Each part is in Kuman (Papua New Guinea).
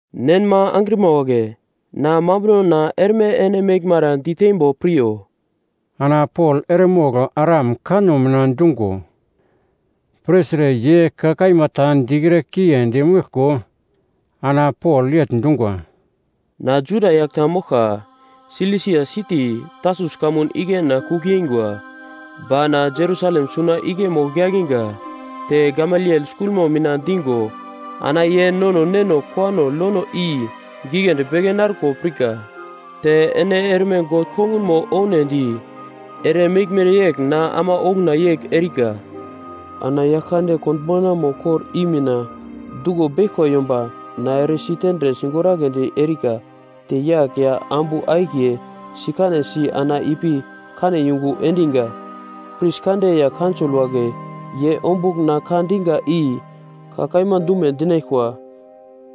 “Nenma angrima wagle, na mambunona erme ene meglmara diteimbo piryo.” Ana Pol eremogl Aram kanno mina dungo pirtre ye ka kaima ta dikre kiendi meglko ana Pol yegl dungwa, “Na Juda yagl ta moglka, Silisia siti, Tarsus kamun igle na kugl yeingwa, ba na Jerusalem suna igle mogl yakinga. Te Gamaliel skulmo mina digo ana ye nono neno kowano lono i giglendi beke narko pirka, te ene erme God kongunmo ounedi eremeglmere yegl na ama okuna yegl erika. Ana Yaglkande Konbaunamo kor i mina duglo beglkwa yomba na eresi tendre sigoragledi erika, te yagl ya ambu akiye sikanesi ana ipi kane yungu endinga. Pris kande ya Kaunsol wagle ye ombugl na ka dinga i ka kaima dume dinaglkwa.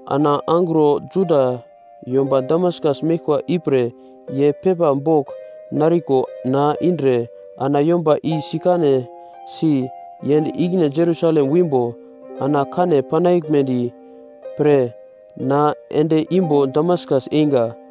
Ana angro Juda yomba Damaskas meglkwa ipre ye pepa bogl nariko na indre ana yomba i sikanesi yend ikine Jerusalem wimbo ana kane panaglmedi pre na ende imbo Damaskas einga.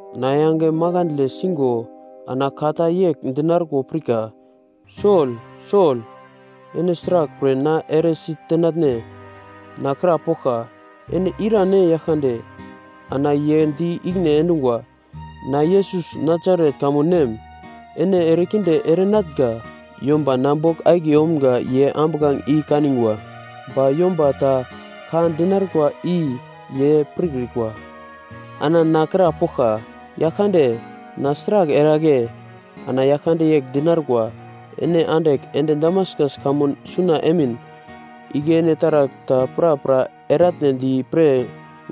Na yange makandle singo ana ka ta yegl dinarko pirka, ‘Sol, Sol! Ene sraglpre na eresi tenatne?’ “Na krapoglka, ‘Ene irane Yaglkande?’ “Ana ye di ikine endungwa, ‘Na Yesus Nasaret kamun nem, ene erekinde erenatnga!’ Yomba na bogl akiye omga ye ambuglange i kanigwa ba yomba ta ka dinarkwa i ye pirkrikwa. “Ana na krapoglka, ‘Yaglkande, na sragl eragle?’ “Ana Yaglkande yegl dinarkwa, ‘Ene andigl ende Damaskas kamun suna emin, igle ene taragl ta prapra eratnedi pre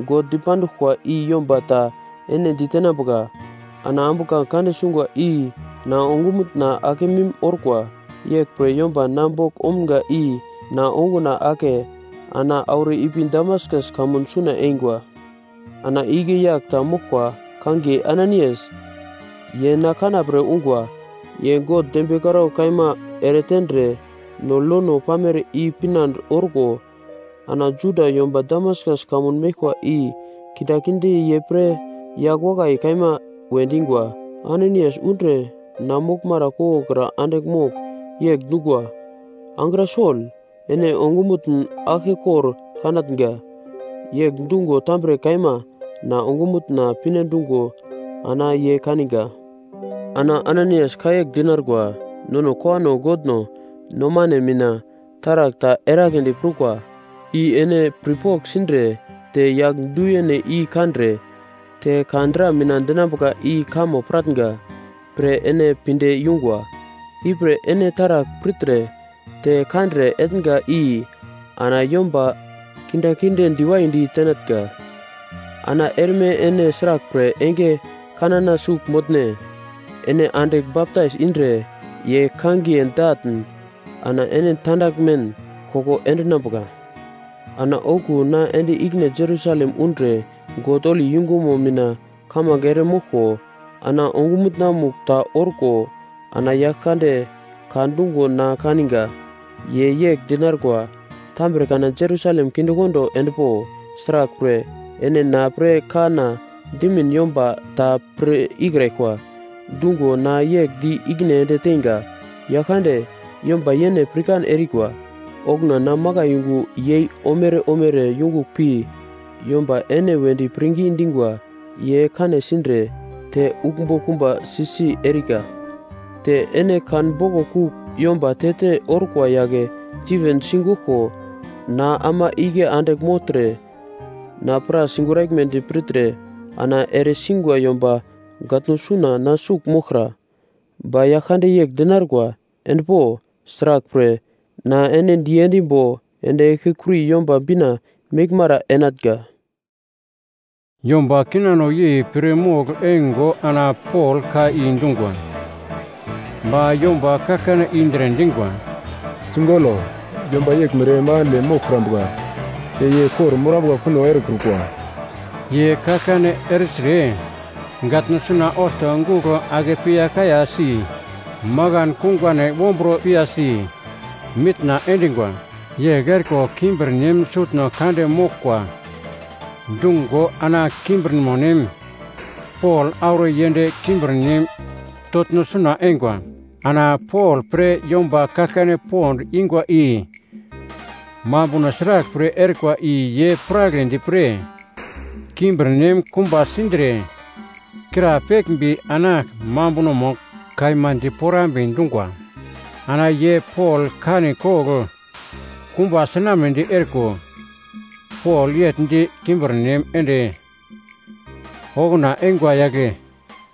God dipanduglkwa i yomba ta ene ditenambuka.’ Ana ambuglange kande sungwa i na ongumutna akemim orkwa, yeglpre yomba na bogl omga i na onguna ake ana auro ipi Damaskas kamun suna eingwa. “Ana igle yagl ta moglkwa kangiye Ananaias, ye na kanapre ungwa. Ye God dembiye karaugl kaima eretendre no lono pamere i pinande orko ana Juda yomba Damaskas kamun meglkwa i kindaginde ye pre yagl wakai kaima we dingwa. Ananaias undre na moglmara koglokra andigl mogl yegl dungwa, ‘Angra Sol, ene ongumutn aglkekor kanatnga!’ Yegl dungo tambre kaima na ongumutna pinedungo ana ye kaninga. “Ana Ananaias ka yegl dinarkwa, ‘Nono kowano Godno nomane mina taragl ta eragledi prukwa, i ene pirpogl sindre te Yagl Du-yene i kandre te ka dra mina dinambuka i kamo piratnga pre ene pinde yungwa. Ipre ene taragl pirtre te kandre etnga i ana yomba kindaginde diwaidi tenatnga. Ana erme ene sraglpre enge kanana sugl motne? Ene andigl baptais indre ye kangiye datn ana ene tandaglmen koko endinambuka.’ “Ana okuwo na ende ikine Jerusalem undre God holi yungumo mina kamange ere moglko ana ongumutna-mugl ta orko, ana Yaglkande ka dungo na kaninga. Ye yegl dinarkwa, ‘Tambre kana Jerusalem kindekondo endpo. Sraglpre, ene na pre kanna dimin yomba ta pir ikraglkwa.’ “Dungo na yegl di ikine ende teinga, ‘Yaglkande, yomba yene pirkan erikwa, okuna na makai yungu yei omere omere yungugl pi yomba ene wedi pirngi dingwa ye kane sindre te uglmbo kumba si-si erika. Te ene kan boglo kugl yomba te-te orkwa yagle Stiven sigeglko na ama igle andigl mogltre, na pra sigoraglmedi pirtre ana eresingwa yomba gatno suna na sugl moglkra.’ “Ba Yaglkande yegl dinarkwa, ‘Endpo. Sraglpre, na ene diendimbo ende eglkekuri Yomba Bina meglmara enatnga.’” Yomba kinano yei pir mogl eingo ana Pol ka i dungwa. Ba yomba kaglkane indre dingwa, “Sigolo, yomba yeglmere makandle moglkrambuka. Te ye kor-morambuka kuno erekrukwa.” Ye kaglkane ertre gatno suna olto gugl ake piya kayasi makan kungane wombro piyasi mitna endingwa. Yegl eriko kimbirnem sutno kande moglkwa dungo ana kimbirmonem Pol auro yend kimbirnem toglno suna eingwa. Ana Pol pre yomba kaglkane pond ingwa i mambuno sraglpre erikwa i ye piragledi pre kimbirnem kumba sindre krapeglmbi ana mambunomo kaima diporambe dungwa. Ana ye Pol kane kogl kumba sinamnedi eriko, Pol yegl di kimbirnem ende okuna eingwa yagle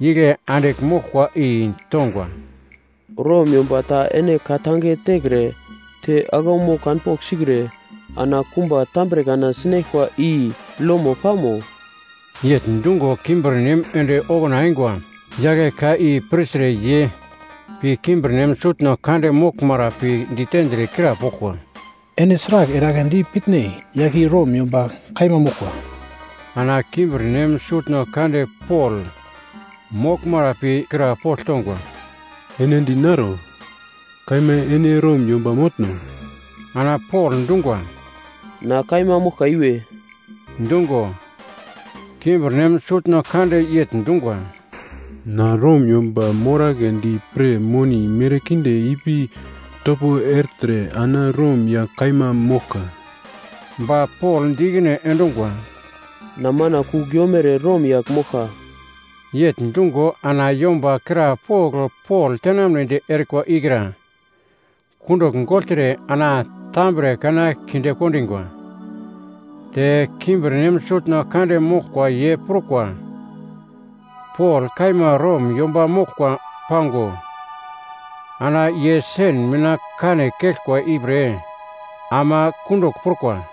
igle andigl moglkwa i tongwa, “Rom yomba ta ene ka-tange tekre te aglaumo kanpogl sikre ana kumba tambre kana sinaglkwa i lomo pamo?” Yegl dungo kimbirnem ende okuna eingwa yagle ka i pirtre ye pi kimbirnem sutno kande moglmara pi ditendre krapoglkwa, “Ene sragl eragledi pitne? Yagl i Rom yomba kaima moglkwa.” Ana kimbirnem sutno kande Pol moglmara pi krapogl tongwa, “Ene dinaro, kaima ene Rom yomba motno?” Ana Pol dungwa, “Na kaima moglka iwe.” Dungo, kimbirnem sutno kande yegl dungwa, “Na Rom yomba moragledi pre moni merkinde ipi topo ertre ana Rom yagl kaima moglka.” Ba Pol di ikine endungwa, “Na mana kugl yomere Rom yagl moglka.” Yegl dungo ana yomba krapogl Pol tenamnedi erikwa ikra kundugl gogltre ana tambre kana kinde kondingwa. Te kimbirnem sutno kande moglkwa ye prukwa Pol kaima Rom yomba moglkwa pango ana ye sen mina kane keglkwa ipre ama kundugl prukwa.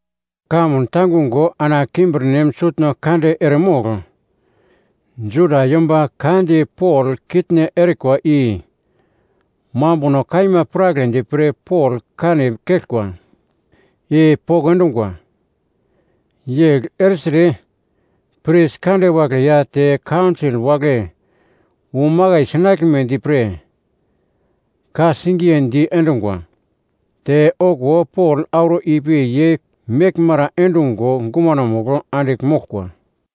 Kamun tangungo ana kimbirnem sutno kande eremogl Juda yomba ka di Pol kitne erikwa i mambuno kaima piragledi pre Pol kane keglkwa i poko endungwa. Yegl ertre pris kande wagle ya te kaunsol wagle wu makai sinaglmedi pre ka-singiye diendungwa. Te okuwo Pol auro ipi ye meglmara endungo gumanomugl andigl moglkwa.